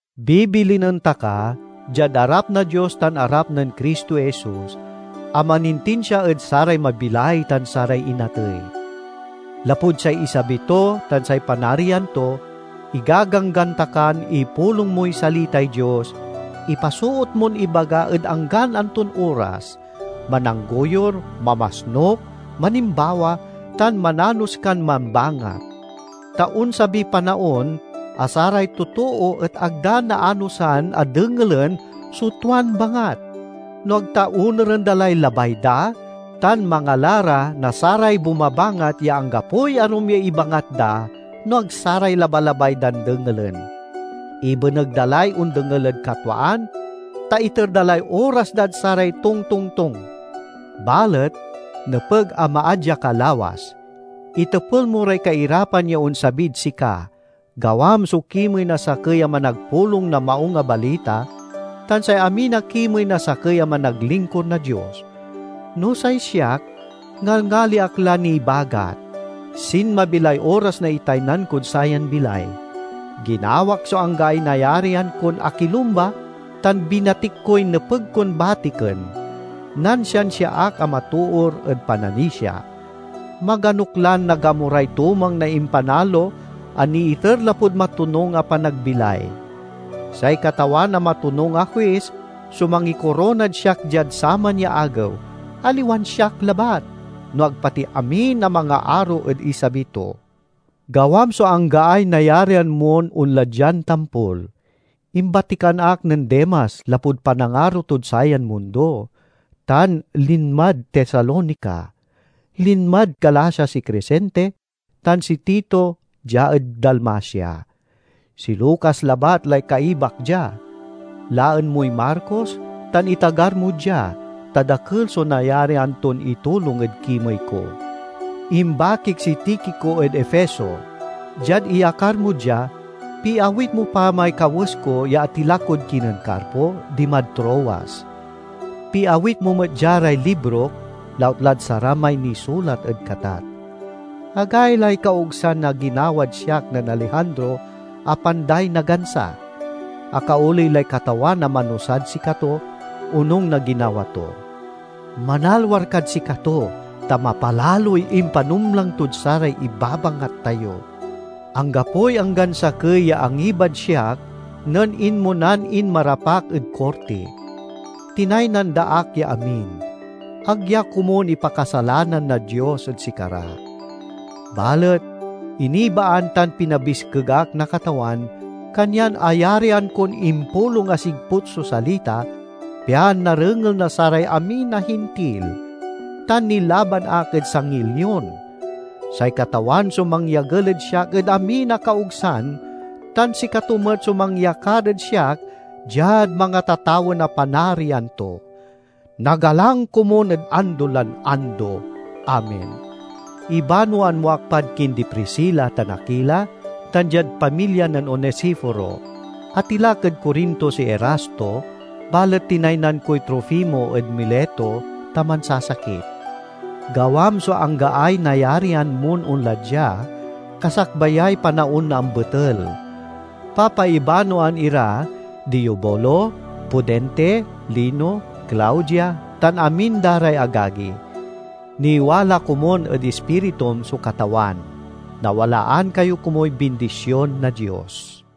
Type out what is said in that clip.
Bibilinen ta ka, diad arap na Dios tan arap nen Cristo Jesus a manintinsia ed saray mabilay tan saray inatey: lapud say isabi to tan say Panarian to, igaganggan ta kan ipulong moy salitay Dios, ipasoot mon ibaga ed anggan anton oras; mananggoyur, mamasnuk, manimbawa, tan mananos kan mambangat. Ta onsabiy panaon a saray totoo et ag da naanosan a dengelen so tuan bangat, no ag ta onuren da lay labay da, tan mangala ra na saray bumabangat ya anggapoy arum ya ibangat da no ag saray labalabay dan dengelen. Ibeneg da lay ondengel ed katwaan, ta iter da lay oras dad saray tongtongtong. Balet nepeg a maadya ka lawas. Itepel mo ray kairapan ya onsabid sika. Gawam so kimey na sakey a managpulong na Maung a Balita, tan say amin a kimey na sakey a managlingkur na Dios. No say siak, ngalngali ak la nibagat; sinmabi lay oras na itaynan kod sayan bilay. Ginawak so anggaay nayarian kon akilumba tan binatik koy nepeg kon batiken. Nansiansia ak a matoor ed pananisia. Maganok lan nagamuray tumang na impanalo a niiter lapud matonung a panagbilay. Say Katawan a matonung a Huis so mangikoronad siak diad saman ya Agew, aliwan siak labat, no ag pati amin a mangaaro ed isabi to. Gawam so anggaay nayarian mon onla dian tampol. Imbatikan ak nen Demas lapud panangaro tod sayan mundo, tan linmad Tesalonica. Linmad Galacia si Cresente, tan si Tito, dia ed Dalmacia. Si Lucas labat lay kaibak dia. Laen moy Marcos tan itagar mo dia, ta dakel so nayarian ton itulong ed kimey ko. Imbakik si Tikico ed Efeso. Diad iyakar mo dia, piawit mo pa may kawes ko ya atilak kod kinen Carpo, dimad Troas. Piawit mo met dia ray librok, lautlad saramay nisulat ed katat. Agaylay kaogsan na ginawad siak nen Alejandro a panday na gansa. Akaoley lay Katawan a manusad sikato, onung na ginawa to. Manalwar kad sikato, ta mapalaloy impanumlang tod saray ibabangat tayo. Anggapoy anggan sakey ya angibad siak nen inmonan inmarap ak ed korti. Tinaynan da ak ya amin. Ag ya komun ipakasalanan na Dios ed sikara! Balet inibaan tan pinabiskeg ak na Katawan, kanyan ayarian kon impulong a sigput so salita, pian narengel na saray amin a Hintil; tan nilaban ak ed sangiy lion. Say Katawan so mangyagel ed siak ed amin a kaogsan, tan sikato met so mangyakar ed siak diad mangatatawen a Panarian to. Nagalang komun ed ando lan ando! Amen. Ibanoan mo ak pad kindi Priscila tan Akila, tan diad pamilya nen Onesiforo. Atilak ed Corinto si Erasto, balet tinaynan koy Trofimo ed Mileto, ta mansasakit. Gawam so anggaay nayarian mon onla dia, kasakbayay panaon na ambetel. Papaibanoan ira di Eubulo, Pudente, Lino, Claudia tan amin da ray agagi. Niwala komun ed ispiritum so Katawan. Nawalaan kayo komuy bindision na Dios.